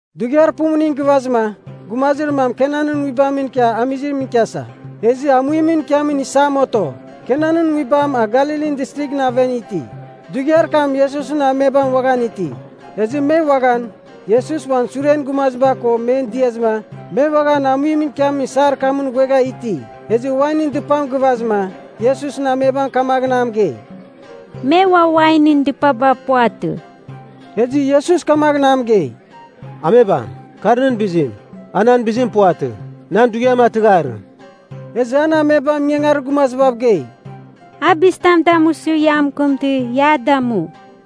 Dughiar pumuning gɨvazɨma, gumazir mam Kanan nguibamɨn ikia amizimɨn ikiasa, ezɨ amuimɨn ikiamin isam oto. Kanan nguibam a Galilin Distrighɨn aven iti. Dughiar kam Iesusɨn amebam uaghan iti. Ezɨ me uaghan Iesus uan suren gumaziba ko men diazɨma me uaghan amuimɨn ikiamin isar kamɨn ghuegha iti. Ezɨ wainɨn dɨpam gɨvazɨma, Iesusɨn amebam kamaghɨn a mɨgei, “Me ua wainɨn dɨpaba puvatɨ.” Ezɨ Iesus kamaghɨn a mɨgei, “Amebam, kar nɨn bizim, a nan bizim puvatɨ. Nan dughiam a tɨgharɨ.” Ezɨ an amebam ingangarir gumazibav gei, “A bizitam damusɨ ia mɨkɨmtɨ, ia a damu.”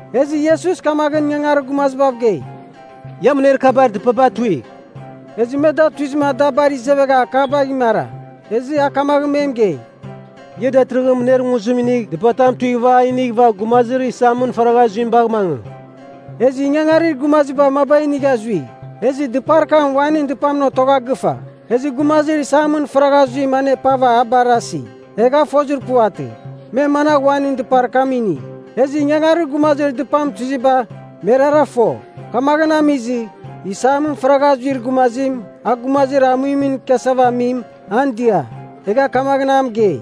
Ezɨ Iesus kamaghɨn ingangarir gumazibav gei, “Ia mɨner kabar dɨpaba tuigh.” Ezɨ me da tuizɨma da bar izevegha akabagh imara. Ezɨ a kamaghɨn me mɨgei, “Ia datɨrɨghɨn mɨner nguzim inigh dɨpatam tuighɨva a inighɨva gumazir isamɨn faragha zuim bagh mangɨ.” Ezɨ ingangarir gumaziba maba inigha zui. Ezɨ dɨpar kam wainɨn dɨpamɨn otogha gɨfa, ezɨ gumazir isamɨn faragha zuim anepava a barasi, egha a fozir puvatɨ, me managh wainɨn dɨpar kam ini. Ezɨ ingangarir gumazir dɨpam tuiziba, merara fo. Kamaghɨn amizɨ, isamɨn faragha zuir gumazim a gumazir amuimɨn ikiasava amim, an dia, egha kamaghɨn a mɨgei,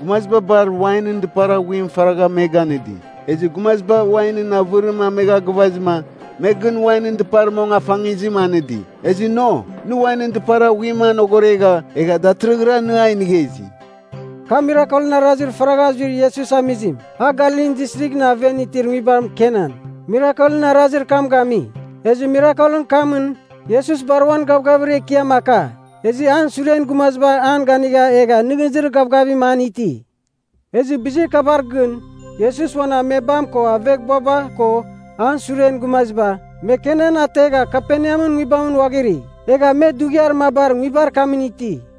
“Gumaziba bar wainɨn dɨpar aghuim faragha me ganɨdi. Ezɨ gumaziba wainɨn avɨrim amegha gɨvazɨma, me gɨn wainɨn dɨpar mong afangizim anɨdi. Ezɨ no, nɨ wainɨn dɨpar aghuimɨn anogoregha, egha datɨrɨghɨra nɨ a inigha izi!” Kar mirakelɨn arazir faragha zuir Iesus amizim. A Galilin Distrighɨn aven itir nguibam Kanan, mirakelɨn arazir kam gami. Ezɨ mirakelɨn kamɨn, Iesus bar uan gavgavir ekiam aka. Ezɨ an suren gumaziba an ganigha egha nɨghnɨzir gavgavim an iti. Ezɨ bizir kabar gɨn, Iesus uan amebam ko aveghbuaba ko an suren gumaziba, me Kanan ategha Kaperneamɨn nguibamɨn ghuaghiri. Egha me dughiar mabar nguibar kamɨn iti.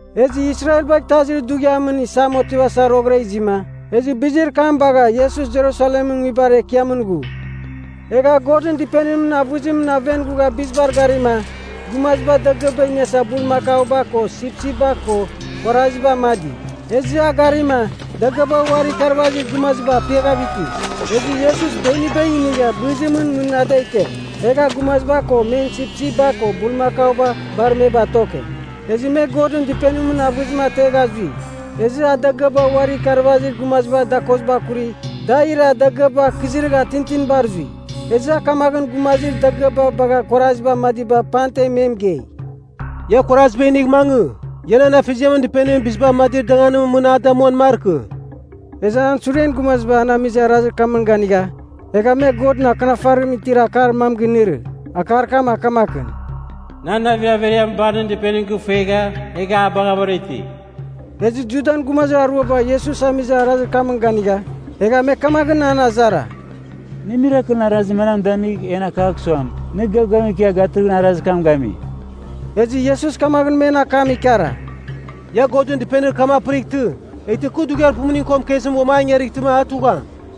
Ezɨ Israel bagh Itazir Dughiamɨn Isam otivasa roghɨra izima, ezɨ bizir kam bagha Iesus Jerusalemɨn nguibar ekiamɨn ghu. Egha a Godɨn Dɨpenimɨn avɨzimɨn aven ghua bizibar garima, gumaziba dagɨaba iniasa bulmakauba ko sipsipba ko kuaraziba amadi. Ezɨ a garima dagɨaba uari ikarvazir gumaziba apiaghav iti. Ezɨ Iesus beniba inigha bɨzimɨn mɨn a da ike. Egha a gumaziba ko men sipsipba ko bulmakauba bar me batoke, ezɨ me Godɨn Dɨpenimɨn avɨzim ategha zui. Ezɨ a dagɨaba uari ikarvazir gumazibar dakoziba akuri da ira dagɨaba akɨziragha tintinibar zui. Ezɨ a kamaghɨn gumazir dagɨaba bagha kuaraziba amadiba pamten me mɨgei, “Ia kuaraziba inigh mangɨ! Ia nan Afeziamɨn dɨpenim biziba amadir danganimɨn mɨn a damuan markɨ.” Ezɨ an suren gumaziba an amizir arazir kamɨn ganigha, egha me Godɨn Akɨnafarimɨn itir akar mam ginɨrɨ. Akar kam a kamakɨn, “Nan navir averiam bar nɨn dɨpenim gɨfuegha egha a baghavɨra iti.” Ezɨ Judan gumazir aruaba Iesus amizir arazir kamɨn ganigha, egha me kamaghɨn an azara, “Nɨ mirakelɨn arazir manam damigh en akagh suam, nɨ gavgavim ikia gatɨrɨghɨn arazir kam gami?” Ezɨ Iesus kamaghɨn men akam ikara, “Ia Godɨn dɨpenir kam apɨrightɨ, eghtɨ kɨ dughiar pumuning ko mɨkezimɨn uam an ingarightɨma a tugham.”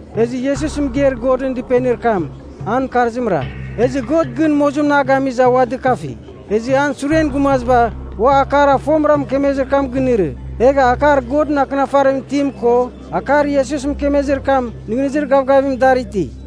Ezɨ Iesus mɨgeir Godɨn dɨpenir kam, an mɨkarzimra. Ezɨ God gɨn mozimɨn a gamizɨma a ua dɨkafi, ezɨ an suren gumaziba ua akar a fomɨra mɨkemezir kam ginɨrɨ. Egha akar Godɨn Akɨnafarimɨn itim ko akar Iesus mɨkemezir kam nɨghnɨzir gavgavim dar iti.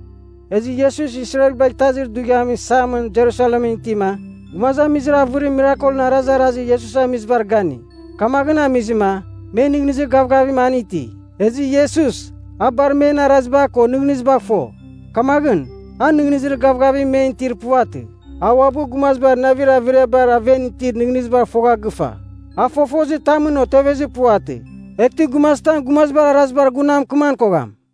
Ezɨ Iesus Israel bagh Itazir Dughiamɨn Isamɨn Jerusalemɨn itima, gumazamizir avɨrim mirakelɨn arazarazir Iesus amizibar gani. Kamaghɨn amizɨma me nɨghnɨzir gavgavim an iti. Ezɨ Iesus, a bar men araziba ko nɨghnɨzibagh fo. Kamaghɨn, a nɨghnɨzir gavgavim men itir puvatɨ. A uabɨ gumazibar navir averiabar aven itir nɨghnɨzibagh fogha gɨfa. A fofozitamɨn otevezir puvatɨ, eghtɨ gumazitam gumazibar arazibar gun a mɨkɨman kogham.